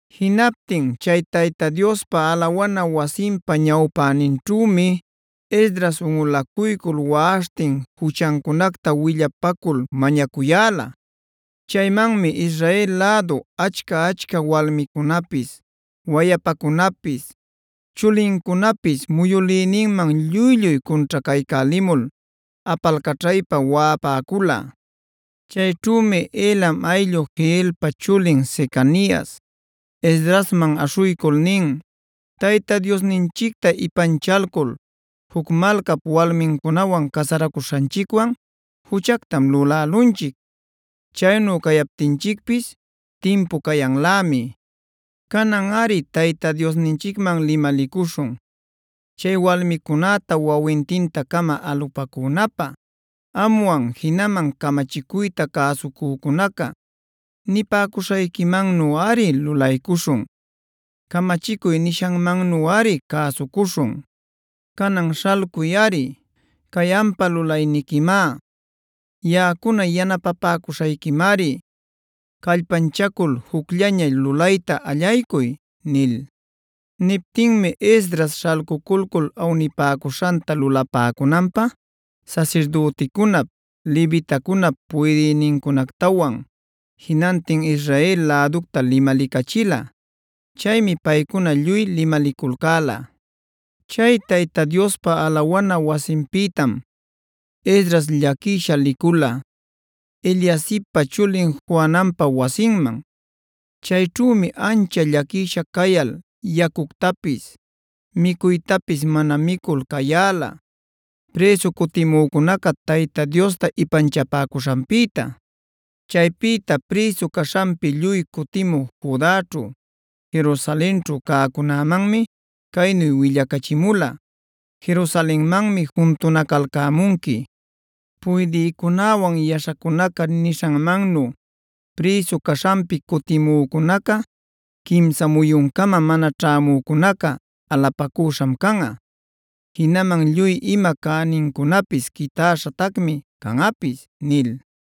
Jinaptin chay Tayta Diospa alawana wasinpa ñawpäninćhümi Esdras unꞌulacuycul waꞌaśhtin juchancunacta willapacul mañacuyäla. Chaymanmi Israel lädu achca-achca walmicunapis, wayapacunapis, chulincunapis muyülïninman lluy-lluy cunćhacaycälimul apalcaćhaypa waꞌapäcula. Chayćhümi Elam ayllu Jehielpa chulin Secanias, Esdrasman aśhuycul nin: “Tayta Diosninchicta ipanchalcul juc malcap walmincunawan casaracuśhanchicwan juchactam lulälunchic. Chaynu cayaptinchicpis timpu cayanlämi. Cananꞌari Tayta Diosninchicman limalicuśhun chay walmicunäta wawintinta-cama alupacünapä. Amwan jinaman camachicuyta cäsucücunaca nipäcuśhayquimannuꞌari lulaycuśhun. Camachicuy nishanmannuꞌari cäsucuśhun. Canan śhalcuyꞌari; cay ampa lulanayquimá. Yaꞌacuna yanapapäcuśhayquimari. ¡Callpanchacul jucllaña lulayta allaycuy!” nil. Niptinmi Esdras śhalcuculcul awnipäcuśhanta lulapäcunanpä sasirdüticunap, levitacunap puydïnincunactawan jinantin Israel läducta limalicachila. Chaymi paycuna lluy limaliculcäla. Chay Tayta Diospa alawana wasinpïtam Esdras llaquisha licula Eliasibpa chulin Johananpa wasinman. Chayćhümi ancha llaquisha cayal yacuctapis, micuytapis mana micul cayäla, prïsu cutimücunaca Tayta Diosta ipanchapäcuśhanpïta. Chaypïta prïsu caśhanpi lluy cutimu Judaćhu, Jerusalenćhu cäcunämanmi caynu willacachimula: “Jerusalenmanmi juntunacalcämunqui. Puydïcunäwan yaśhacunaca nishanmannu prïsu caśhanpi cutimücunaca quimsa muyuncama mana ćhämücunaca alupacüśham canꞌa. Jinaman lluy ima cänincunapis quitäśhatacmi canꞌapis” nil.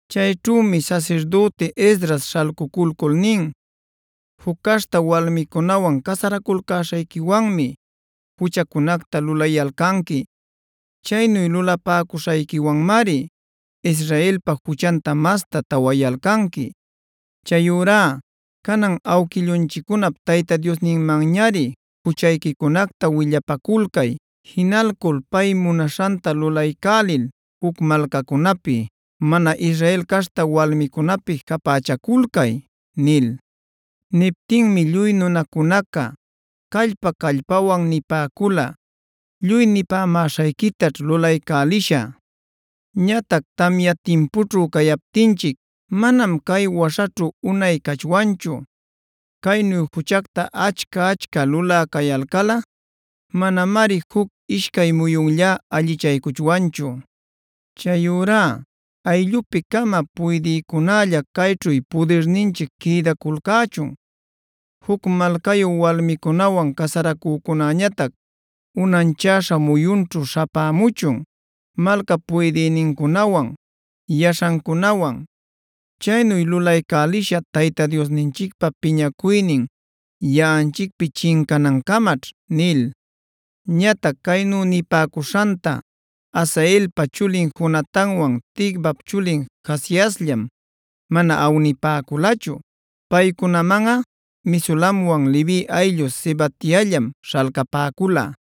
Chayćhümi sasirdüti Esdras śhalcuculcul nin: “Juc caśhta walmicunawan casaraculcäśhayquiwanmi juchacunacta lulayalcanqui. Chaynu lulapäcuśhayquiwanmari Israelpa juchanta masta tawayalcanqui. Chayurá cananꞌa awquillunchiccunap Tayta Diosninmanñamari juchayquicunacta willapaculcay. Jinalcul pay munaśhanta lulaycälil juc malcacunäpi, mana Israel caśhta walmicunäpi japächaculcay” nil. Niptinmi lluy nunacunaca callpa-callpawan nipäcula: “Lluy nipämäśhayquitaćh lulaycälishä. Ñatac tamya timpućhu cayaptinchic manam cay waśhaćhu unay cachwanchu. Caynu juchacta achca-achca lulä cayalcalꞌa manamari juc ishcay muyunlla allichaycuchwanchu. Chayurá ayllupi-cama puydïcunälla cayćhu pudirninchic quïdaculcächun. Juc malcayu walmicunawan casaracücunäñatac unanchaśha muyunćhu śhapämuchun, malcap puydïnincunawan, yaśhancunawan. Chaynu lulaycälishä Tayta Diosninchicpä piñacuynin yaꞌanchicpi chincanancamaćh” nil. Ñatac caynu nipäcuśhanta Asaelpa chulin Jonatanwan Ticvap chulin Jahaziasllam mana awnipäculachu. Paycunamanꞌa Mesulamwan Levi ayllu Sabetaillam śhalcapäcula.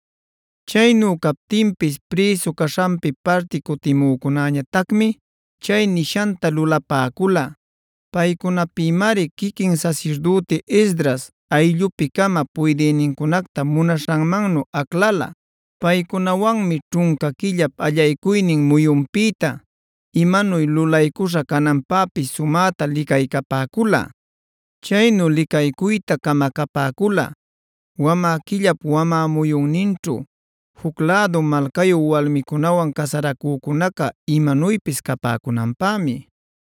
Chaynu captinpis prïsu caśhanpi parti cutimücunäñatacmi chay nishanta lulapäcula. Paycunapïmari quiquin sasirdüti Esdras ayllupi-cama puydïnincunacta munaśhanmannu aclala. Paycunawanmi ćhunca quillap allaycuynin muyunpïta imanuy lulaycuśha cananpäpis sumäta licaycapäcula. Chaynu licaycuyta camacapäcula wamä quillap wamä muyunninćhu juc lädu malcayu walmicunawan casaracücunaca imanuypis capäcunanpämi.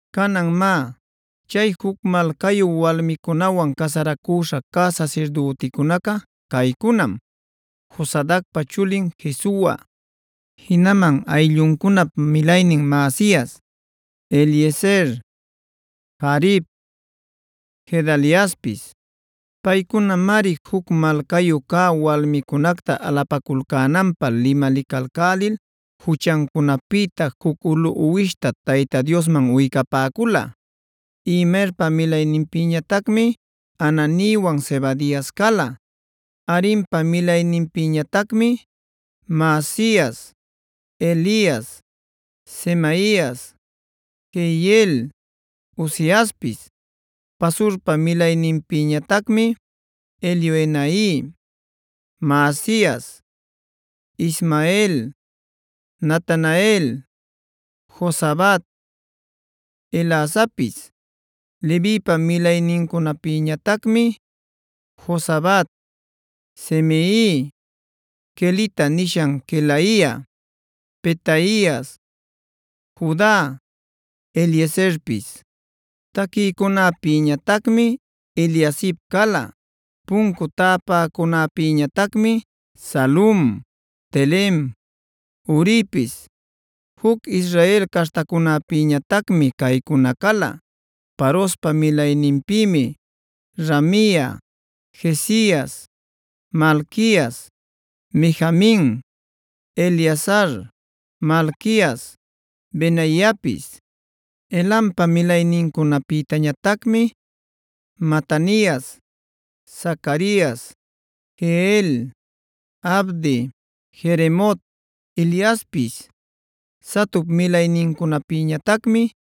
Canan má, chay juc malcayu walmicunawan casaracüśha cä sasirdüticunaca caycunam: Josadacpa chulin Jesua, jinaman aylluncunap milaynin Maasias, Eliezer, Jarib, Gedaliaspis. Paycunamari juc malcayu cä walmincunacta alapaculcänanpä limalicalcälil juchancunapïta juc ulu uwishta Tayta Diosman uycapäcula. Imerpa milayninpïñatacmi Hananiwan Zebadias cala. Harimpa milayninpïñatacmi: Maasias, Elias, Semaias, Jehiel, Uziaspis. Pasurpa milayninpïñatacmi: Elioenai, Maasias, Ismael, Natanael, Jozabad, Elasapis. Levipa milaynincunapïñatacmi: Jozabad, Simei, Kelita nishan Kelaia, Petaias, Juda, Eliezerpis. Taquïcunapïtañatacmi Eliasib cala. Puncu täpäcunäpïñatacmi: Salum, Telem, Uripis. Juc Israel caśhtacunäpïñatacmi caycuna cala: Parospa milayninpïmi: Ramia, Jezias, Malquias, Mijamin, Eleazar, Malquias, Benaiapis. Elampa milaynincunapïñatacmi: Matanias, Zacarias, Jehiel, Abdi, Jeremot, Eliaspis. Zatup milaynincunapïñatacmi: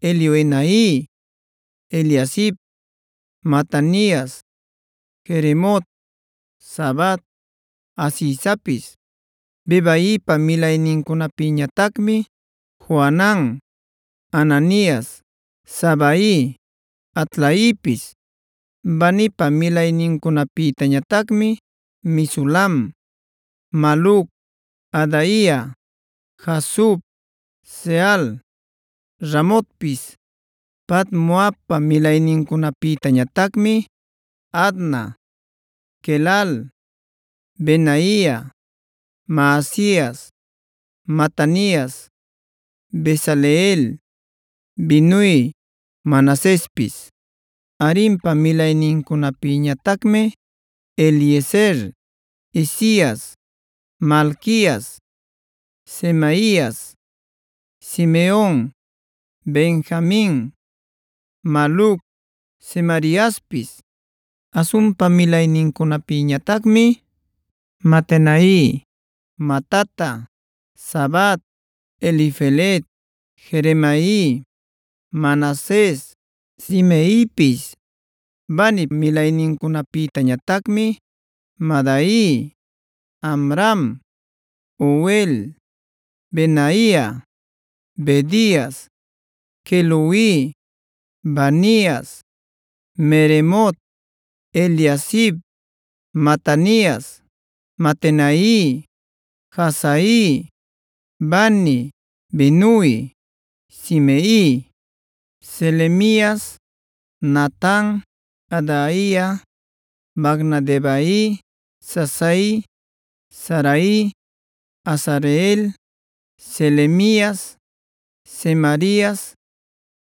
Elioenai, Eliasib, Matanias, Jeremot, Zabad, Azizapis. Bebaipa milaynincunapïñatacmi: Johanan, Hananias, Zabai, Atlaipis. Banipa milaynincunapïñatacmi: Mesulam, Maluc, Adaia, Jasub, Seal, Ramotpis. Pahat-moabpa milaynincunapïñatacmi: Adna, Quelal, Benaia, Maasias, Matanias, Bezaleel, Binui, Manasespis. Harimpa milaynincunapïñatacmi: Eliezer, Isias, Malquias, Semaias, Simeon, Benjamin, Maluc, Semariaspis. Hasumpa milaynincunapïñatacmi: Matenai, Matata, Zabad, Elifelet, Jeremai, Manases, Simeipis. Banip milaynincunapïtañatacmi: Madai, Amram, Uel, Benaia, Bedias, Queluhi, Vanias, Meremot, Eliasib, Matanias, Matenai, Jaasai, Bani, Binui, Simei, Selemias, Natan, Adaia, Macnadebai, Sasai, Sarai, Azareel, Selemias, Semarias,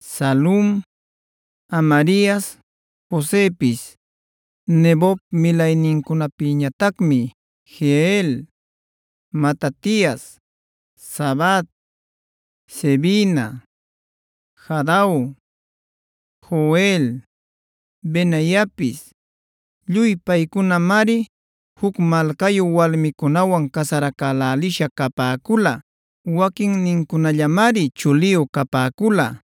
Salum, Amarias, Josepis. Nebop milaynincunapïñatacmi: Jeiel, Matatias, Zabad, Zebina, Jadau, Joel, Benaiapis. Lluy paycunamari juc malcayu walmicunawan casaracälälisha capäcula. Waquinnincunallamari chuliyu capäcula.